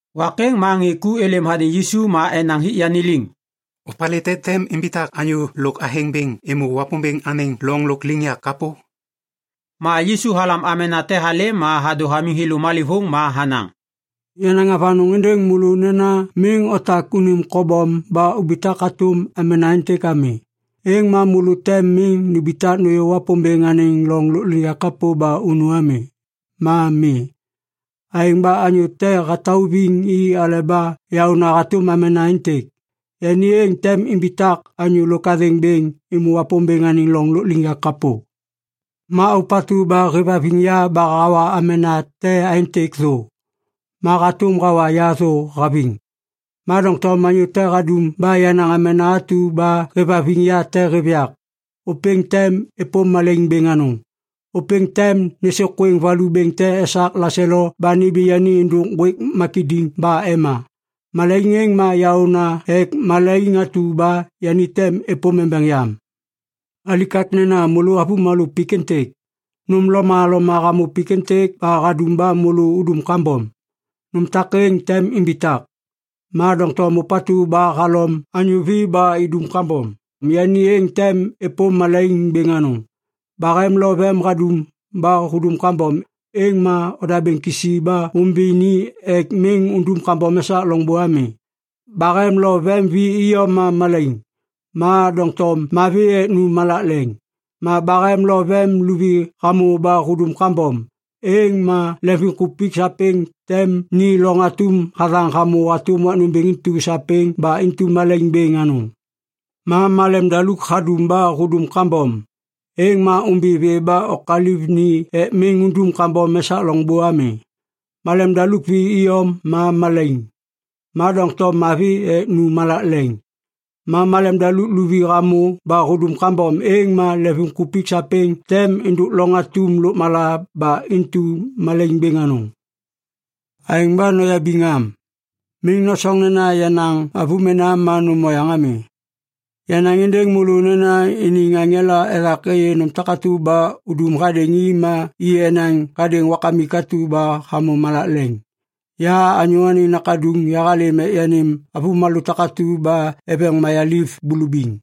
Wak êŋ ma ŋê ku êlêm hadêŋ Yisu ma enaŋ hik yani liŋ, “Opalê te tem imbitak anyô lôk athêŋ bêŋ êmô Wapômbêŋ anêŋ loŋ lôkliŋyak kapô?” Ma Yisu halam amena te halêm ma hadô hamiŋ thêlô malêvôŋ ma hanaŋ, “Yanaŋ avanôŋ êndêŋ môlô nena miŋ otak unim kobom ba ubitak hatôm amena êntêk ami, êŋ ma môlô tem miŋ numbitak nôyô Wapômbêŋ anêŋ loŋ lôkliŋyak kapô ba unu ami. Ma mi. Aêŋ ba anyô te hatauviŋ i aleba yaôna hatôm amena êntêk, yani êŋ tem imbitak anyô lôk athêŋ bêŋ êmô Wapômbêŋ anêŋ loŋ lôkliŋyak kapô. Ma ôpatu ba hêvhaviŋ ya ba hawa amena te aêntêk thô, ma hatôm hawa ya thô haviŋ. “Ma doŋtom anyô te hadum ba yenaŋ amena atu ba hêvhaviŋ ya te hêv yak, ôpêŋ tem êpôm malaiŋ bêŋ anôŋ. Ôpêŋ tem nêsôkwêŋ valu bêŋ te esak laselo ba nimbi yani êndôk ŋgwêk makidiŋ ba ema. Malaiŋ êŋ ma yaôna ek malaiŋ atu ba yani tem êpôm embeŋ yam. “Alikaknena môlô avômalô pik êntêk! Nôm lomaloma hamô pik êntêk ba hadum ba môlô udum kambom. Nôm takêŋ tem imbitak. Ma doŋtom ôpatu ba halom anyô vi ba idum kambom, yani êŋ tem êpôm malaiŋ bêŋ anôŋ. Bahem lo vem hadum ba hudum kambom, êŋ ma odabêŋ kisi ba umbini ek miŋ undum kambom esak loŋbô ami! Bahem lo vem vi iyom ma malaiŋ, ma doŋtom mavi ek nu malak leŋ. Ma bahem lo vem luvi hamô ba hudum kambom, êŋ ma lemvimkupik sapêŋ tem ni loŋ atum hathaŋ hamô hatôm wak nômbêŋ intu sapêŋ ba intu malaiŋ bêŋ anôŋ. Ma malem daluk hadum ba hudum kambom, êŋ ma ômbi vê ba okaliv ni ek miŋ undum kambom esak loŋbô ami! Malem daluk vi iyom ma malaiŋ, ma doŋtom mavi ek nu malak leŋ. Ma malem daluk luvi hamô ba hudum kambom êŋ ma lemvimkupik sapêŋ tem êndôk loŋ atum lôkmala ba intu malaiŋ bêŋ anôŋ. “Aêŋ ba noyabiŋ am! Miŋ nosoŋ nena yenaŋ avômena ma nôm oyaŋ ami. Yanaŋ êndêŋ môlô nena iniŋ aŋela ethak êyê nôm takatu ba udum hadêŋ i ma i enaŋ hadêŋ Wakamik atu ba hamô malak leŋ. Ya Anyô Anêŋ Nakaduŋ yahalêm ek yanêm avômalô takatu ba eveŋ mayaliv bulubiŋ.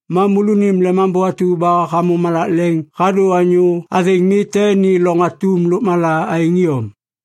Ma môlônim Lemambô atu ba hamô malak leŋ hadô anyô athêŋ mi te ni loŋ atum lôkmala aêŋ iyom.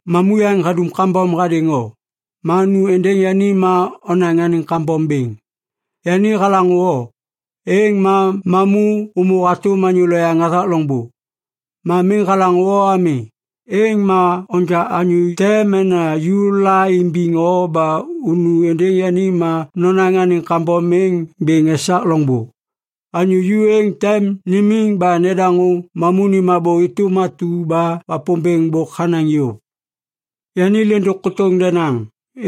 “Mamuyaŋ hadum kambom hadêŋ o, ma nu êndêŋ yani ma onaŋ anêŋ kambom bêŋ. Yani halaŋô o, êŋ ma mamu ômô hatôm anyô loyaŋ hathak loŋbô. Ma miŋ halaŋô o ami, êŋ ma onja anyô te mena ju la imbiŋ o ba unu êndêŋ yani ma nonaŋ anêŋ kambom êŋ bêŋ esak loŋbô. Anyô ju êŋ tem nimiŋ ba nedaŋô mamunim abô êtôm atu ba Wapômbêŋ bôk hanaŋ yôv. Yani lêndôŋ kôtôŋ denaŋ,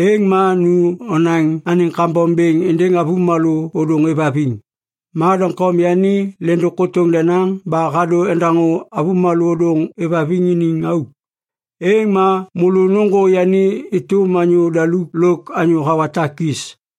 êŋ ma nu onaŋ anêŋ kambom bêŋ êndêŋ avômalô ôdôŋ êvhaviŋ. Ma doŋtom yani lêndôŋ kôtôŋ denaŋ ba hadô endaŋô avômalô ôdôŋ êvhaviŋ iniŋ auk, êŋ ma môlô nôŋgô yani êtôm anyô daluk lôk anyô hawa takis.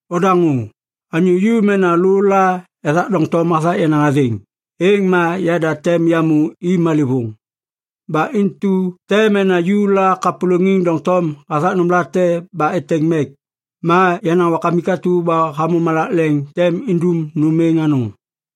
“Odaŋô! Anyô ju mena lu la ethak doŋtom hathak yenaŋ athêŋ, êŋ ma yada tem yamô i malêvôŋ. Ba intu te mena ju la kapôlôŋiŋ doŋtom hathak nômlate ba eteŋ mek, ma yenaŋ Wakamik atu ba hamô malak leŋ tem indum nôm êŋ anôŋ.”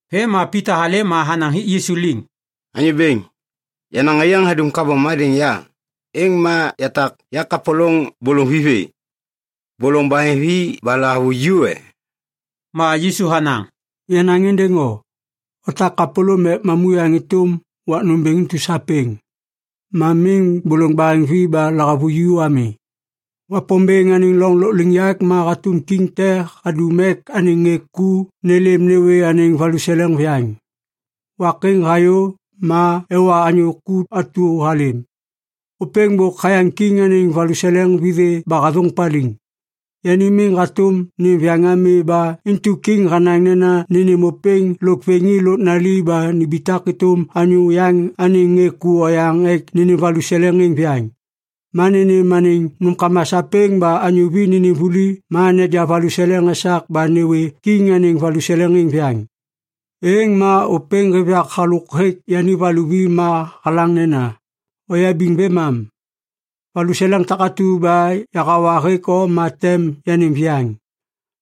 Vêm ma Pita halêm ma hanaŋ hik Yisu liŋ, “Anyô Bêŋ, yenaŋ aiyaŋ hadum kambom hadêŋ ya, êŋ ma yatak yakapôlôŋ bôlôŋ vithê? Bôlôŋ baheŋvi ba lahavuju, e?” Ma Yisu hanaŋ, “Yanaŋ êndêŋ o. Otak kapôlôm ek mamuyaŋ êtôm wak nômbêŋ intu sapêŋ, ma miŋ bôlôŋ baheŋvi ba lahavuju ami! “Wapômbêŋ anêŋ loŋ lôkliŋyak ma hatôm kiŋ te hadum ek anêŋ ŋê ku nêlêm nêwê anêŋ valuseleŋ viyaŋ. Wak êŋ hayô, ma ewa anyô ku atu halêm. Ôpêŋ bôk hayaŋ kiŋ anêŋ valuseleŋ vithê ba hathôŋ paliŋ. Yani miŋ hatôm nêm viyaŋ ami ba intu kiŋ hanaŋ nena nênêm ôpêŋ lôk veŋi lôk nali ba nimbitak êtôm anyô yaŋ anêŋ ŋê ku oyaŋ ek nênêm valuseleŋ êŋ viyaŋ. Ma nênêm anêŋ nômkama sapêŋ ba anyô vi nênêm vuli ma neja valuseleŋ esak ba nêwê kiŋ anêŋ valuseleŋ êŋ viyaŋ. “Êŋ ma ôpêŋ hêv yak halôk hêk yani valuvi ma halaŋ nena, ‘Oyabiŋ vêmam! Valuseleŋ takatu ba yahawa hêk o ma tem yanêm viyaŋ.’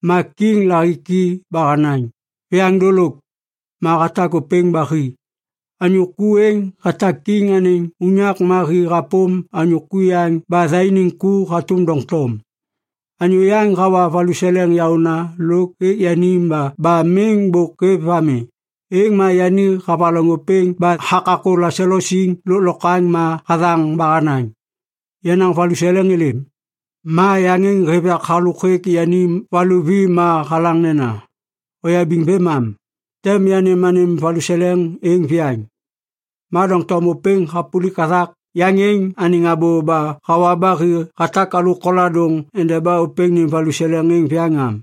Ma kiŋ lahiki ba hanaŋ, ‘Viyaŋ dôlôk!’ Ma hatak ôpêŋ ba hi. “Anyô ku êŋ hatak kiŋ anêŋ unyak ma hi hapôm anyô ku yaŋ ba thainiŋ ku hatôm doŋtom. Anyô yaŋ hawa valuseleŋ yaôna lôk hêk yani ba miŋ bôk hêv ami. Êŋ ma yani havaloŋ ôpêŋ ba hakakô laselo siŋ lôklokwaŋ ma hathaŋ ba hanaŋ, ‘Yenaŋ valuseleŋ êlêm!’ “Ma yaŋ êŋ hêv yak halôk hêk yani valuvi ma halaŋ nena, ‘Oyabiŋ vêmam! Tem yanêm anêm valuseleŋ êŋ viyaŋ.’ “Ma doŋtom ôpêŋ hapôlik hathak yaŋ êŋ anêŋ abô ba hawa ba hi hatak halôk koladôŋ endeba ôpêŋ nêm valuseleŋ êŋ viyaŋ am.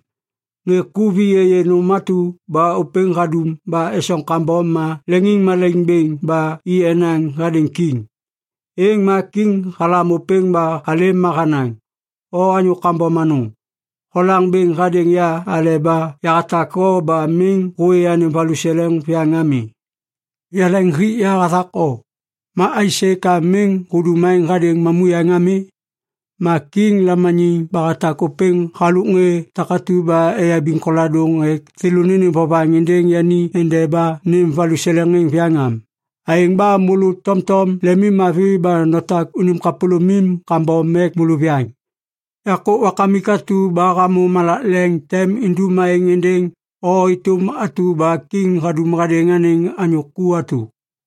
Ŋê ku vi êyê nôm atu ba ôpêŋ hadum ba esoŋ kambom ma leŋiŋmalaiŋ bêŋ ba i enaŋ hadêŋ kiŋ. “Êŋ ma kiŋ halam ôpêŋ ba halêm ma hanaŋ, ‘O anyô kambom anôŋ! Holaŋ bêŋ hadêŋ ya aleba yahatak o ba miŋ hôwê anêm valuseleŋ viyaŋ ami. Yaleŋ hik ya hathak o, ma aisê ka miŋ hudum aêŋ hadêŋ mamuyaŋ ami?’ Ma kiŋ lamaniŋ ba hatak ôpêŋ halôk ŋê takatu ba eyabiŋ koladôŋ ek thêlô nênêm vovaŋ êndêŋ yani endeba nêm valuseleŋ êŋ viyaŋ am. “Aêŋ ba môlô tomtom lemimmavi ba notak unim kapôlômim kambom ek môlôviyaŋ. Yakô Wakamik atu ba hamô malak leŋ tem indum aêŋ êndêŋ o êtôm atu ba kiŋ hadum hadêŋ anêŋ anyô ku atu.”